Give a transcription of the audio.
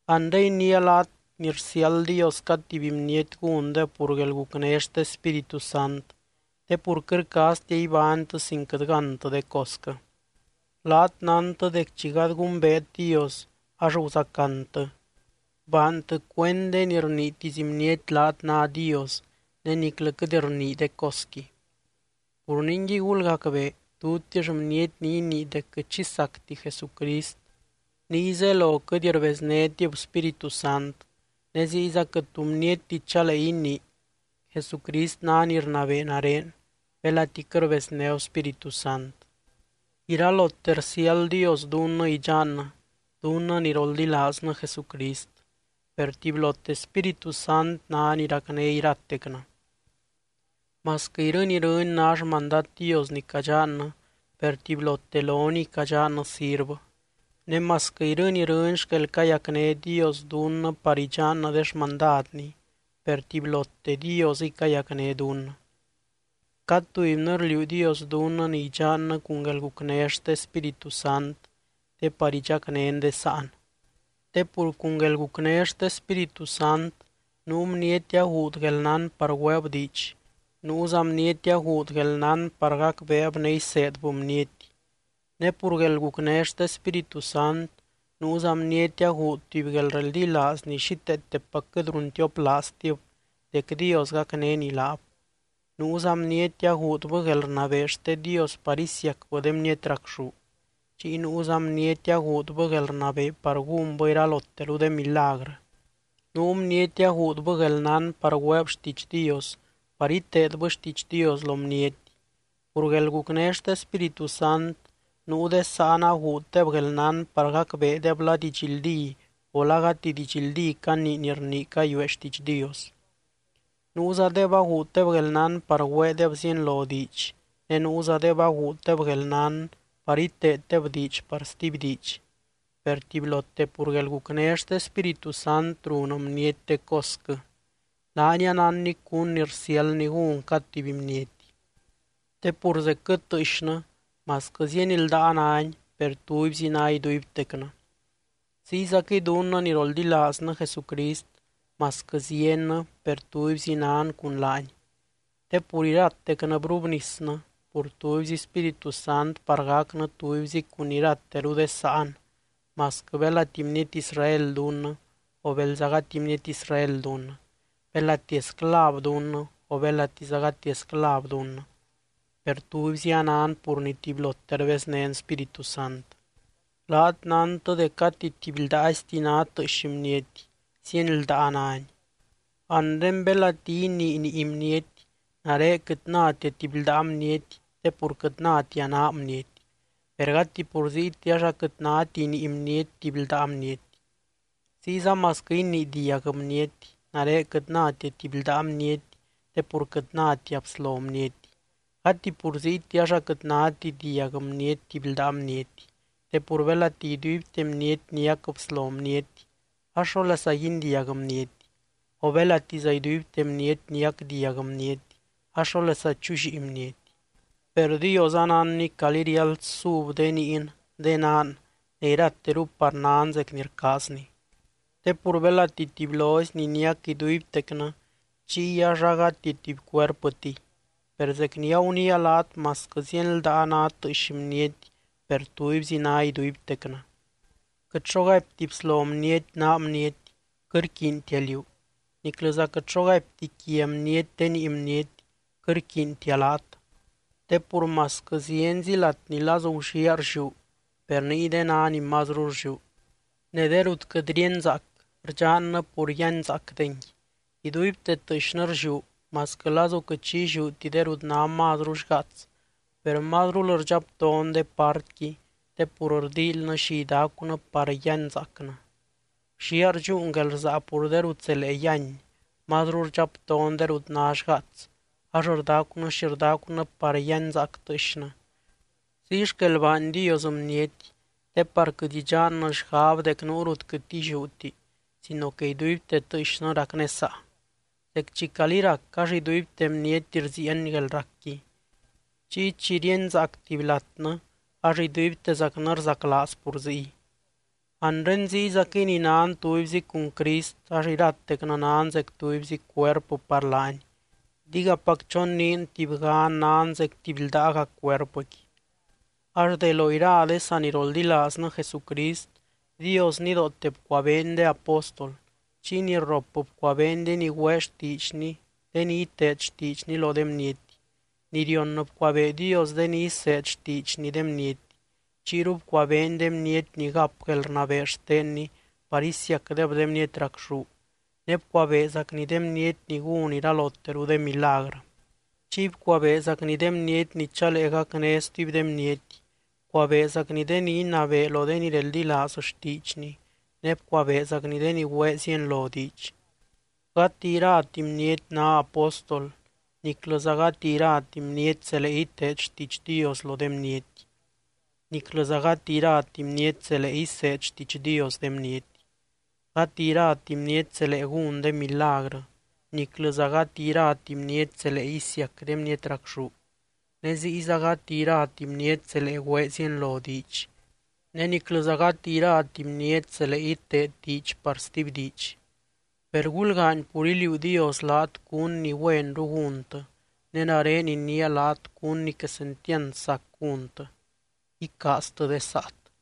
Anre iniia laat ni rsiáld Dios cad tuby bniety gúndeb pur guelgucné xte Spíritu Sant, te pur quɨt rcaaztia ibánytɨ sin quɨt gántɨ de cosquɨ. Laat nántɨ dec chi gady gumbeet Dios ax guzacantɨ, baantɨ cuend de ni rniitisy bniety laat ná dios ne niclɨ quɨt rnii de cosqui. Pur ningui gulgacbee, tutix bniety ni inii dec quɨt xi sacti Jesucrist, niy zelo quɨt rbeznétib Spíritu Sant. Ne ziyza quɨt tu bnietti chalee inii: “¡Jesucrist ná ni rnabee nare!”, belati quɨt rbeznéb Spíritu Sant. Iralote rsiáld Dios dunnɨ idxannɨ, dunnɨ ni roldilaaznɨ Jesucrist, per tubylote Spíritu Sant ná ni racné iratecnɨ. Masquɨ irɨny, irɨny ná xmandad Dios ni cadxannɨ, per tubylote loniy cadxannɨ sirvɨ. Ne masquɨ irɨny, irɨny xquel cayacné Dios dunnɨ par idxannɨ de xmandadny, per tubylote Diosɨy cayacné dunnɨ. Cad tubynɨ rliuu Dios dunnɨ ni idxannɨ cun guelgucné xte Spíritu Sant te par idxacnén de sáan. Te pur cun guelgucné xte Spíritu Sant nuu bniety aguud guelnán par güeeb diidx, nuuza bniety aguud guelnán par gacbeeb ne iseedbɨ bniety. Ne pur guelgucné xte Spíritu Sant nuuza bniety aguud tuby guelreldilaaz ni xíteetepac quɨt runtioplaaztib dec Dios gacnény laab. Nuuza bniety aguudbɨ guelrnabee xte Dios par isiacbɨ de bniety racxú. Chiy nuuza bniety aguudbɨ guelrnabee par gúnbɨ iraloteru de milagrɨ. Nuu bniety aguudbɨ guelnán par güeeb xtiidx Dios par iteedbɨ xtiidx Dios lo bniety. Pur guelgucné xte Spíritu Sant nuu de sáan aguuddeb guelnán par gacbeedeb la didxldí o la gati didxldí canii ni rnii cayuee xtiidx Dios. Nuuzadeb aguuddeb guelnán par güeedeb zienlo diidx, ne nuuzadeb aguuddeb guelnán par iteeddeb diidx par stuby diidx. Per tubylote pur guelgucné xte Spíritu Sant run bniety de cosquɨ, laany anánny cún ni rsiáldny gún cad tuby bniety. Te pur zecquɨ tɨɨxnɨ masquɨ zieny ldaa náni, per tubyzi ná iduibtecnɨ. Ziyzaquɨy dunnɨ ni roldilaaznɨ Jesucrist masquɨ ziennɨ per tubyzi nan cun laany. Te pur iratecnɨ brubnisnɨ pur tubyzi Spíritu Sant par gacnɨ tubyzi cun irateru de sáan masquɨ belati bniety Israel dunnɨ o belza gati bniety Israel dunnɨ, belati esclav dunnɨ o belatiza gati esclav dunnɨ, per tubyzi anan pur ni tubylote rbeznén Spíritu Sant. Laat nántɨ dec gati tuby ldaaizti ná tɨɨx bniety, zieny ldaa náni. Anre belati inii nii bniety, “Nare quɨt nátia tuby ldaa bniety te pur quɨt nátia naa bniety.” Per gati pur ziyti ax aquɨt náti nii bniety tuby ldaa bniety. Ziyza masquɨ inii diag bniety: “Nare quɨt nátia tuby ldaa bniety te pur quɨt nátia bslo bniety”, gati pur ziyti ax aquɨt náti diag bniety tuby ldaa bniety. Te pur belati iduibte bniety niac bslo bniety ax, ¿xólesa guindiag bniety? O belatiza iduibte bniety niac diag bniety ax, ¿xólesa chullíi bniety? Per Dios anánny calí riáld sub de niin, de naan ne irateru par nan zec ni rcaazny. Te pur belati tubylozy ni niac iduibtecnɨ chiy ax agati tuby cuerpɨtiy. Per zec ni aguniia laat masquɨ zieny ldaa ná tɨɨx bniety per tubyzi ná iduibtecnɨ. Quɨt xo gaipti bslo bniety naa bniety: “Quɨt rquiintia liú.” Niclɨza quɨt xo gaipti quia bniety de nii bniety: “Quɨt rquiintia laat.” Te pur masquɨ zienzi lat ni lazu gulliaa rlliú, per niyde ná ni mazru rlliú. Ne de rut quɨt ríenzaac, rdxannɨ pur yíanzaacdengui. Iduibte tɨɨxnɨ rlliú, masquɨ lazu quɨt xi illiúti de rut ná mazru xgaats, per mazrul rdxapton de partqui te pur rdíilynɨ xi idacunɨ par yíanzaacnɨ. Gulliaa rdxúun guelrsaa pur de rut zelee yíany, mazru rdxapton de rut ná xgaats ax rdacunɨ xi rdacunɨ par yíanzaac tɨɨxnɨ. Ziy xquel baany Dios bniety te par quɨt idxannɨ xgab dec nuu rut quɨt illiúti sino que iduibte tɨɨxnɨ racnésaa. Zec chi calí rac ax iduibte bniety rziieny guelracqui, chiy chi ríenzaac tuby latnɨ ax iduibtezacnɨ rzaclaaz pur ziy. Anre ziyzaquɨy ni nan tubyzi cun Crist ax iratecnɨ nan zec tubyzi cuerpɨ par laany, digapac choniin tubygan nan zec tuby ldaaga cuerpɨqui. Ax de lo ira de saniroldilaaznɨ Jesucrist, Dios nidoote bcuabeeny de apóstol, chiy ni rrop bcuabeeny de ni güee xtiidxny de ni iteed xtiidxny lo de bniety, ni rion bcuabee Dios de ni iseed xtiidxny de bniety. Chiyru bcuabeeny de bniety ni gap guelrnabee xtenny par isiacdeb de bniety racxú, ne bcuabeezacny de bniety ni gún iraloteru de milagrɨ. Chiy bcuabeezacny de bniety ni chalee gacné stuby de bniety, bcuabeezacny de ni inabee lo de ni reldilaaz xtiidxny ne bcuabeezacny de ni güee zienlo diidx. Gati irati bniety ná apóstol, niclɨza gati irati bniety zelee iteed xtiidx Dios lo de bniety, niclɨza gati irati bniety zelee iseed xtiidx Dios de bniety. Gati irati bniety zelee gún de milagrɨ, niclɨza gati irati bniety zelee isiac de bniety racxú, ne ziyza gati irati bniety zelee güee zienlo diidx ne niclɨza gati irati bniety zelee iteed diidx par stuby diidx. Per gulgaany pur iliuu Dios laat cún ni güenru gúntɨ, ne nare iniia laat cún ni quesentiand sac gúntɨ: Icaaztɨ de saat.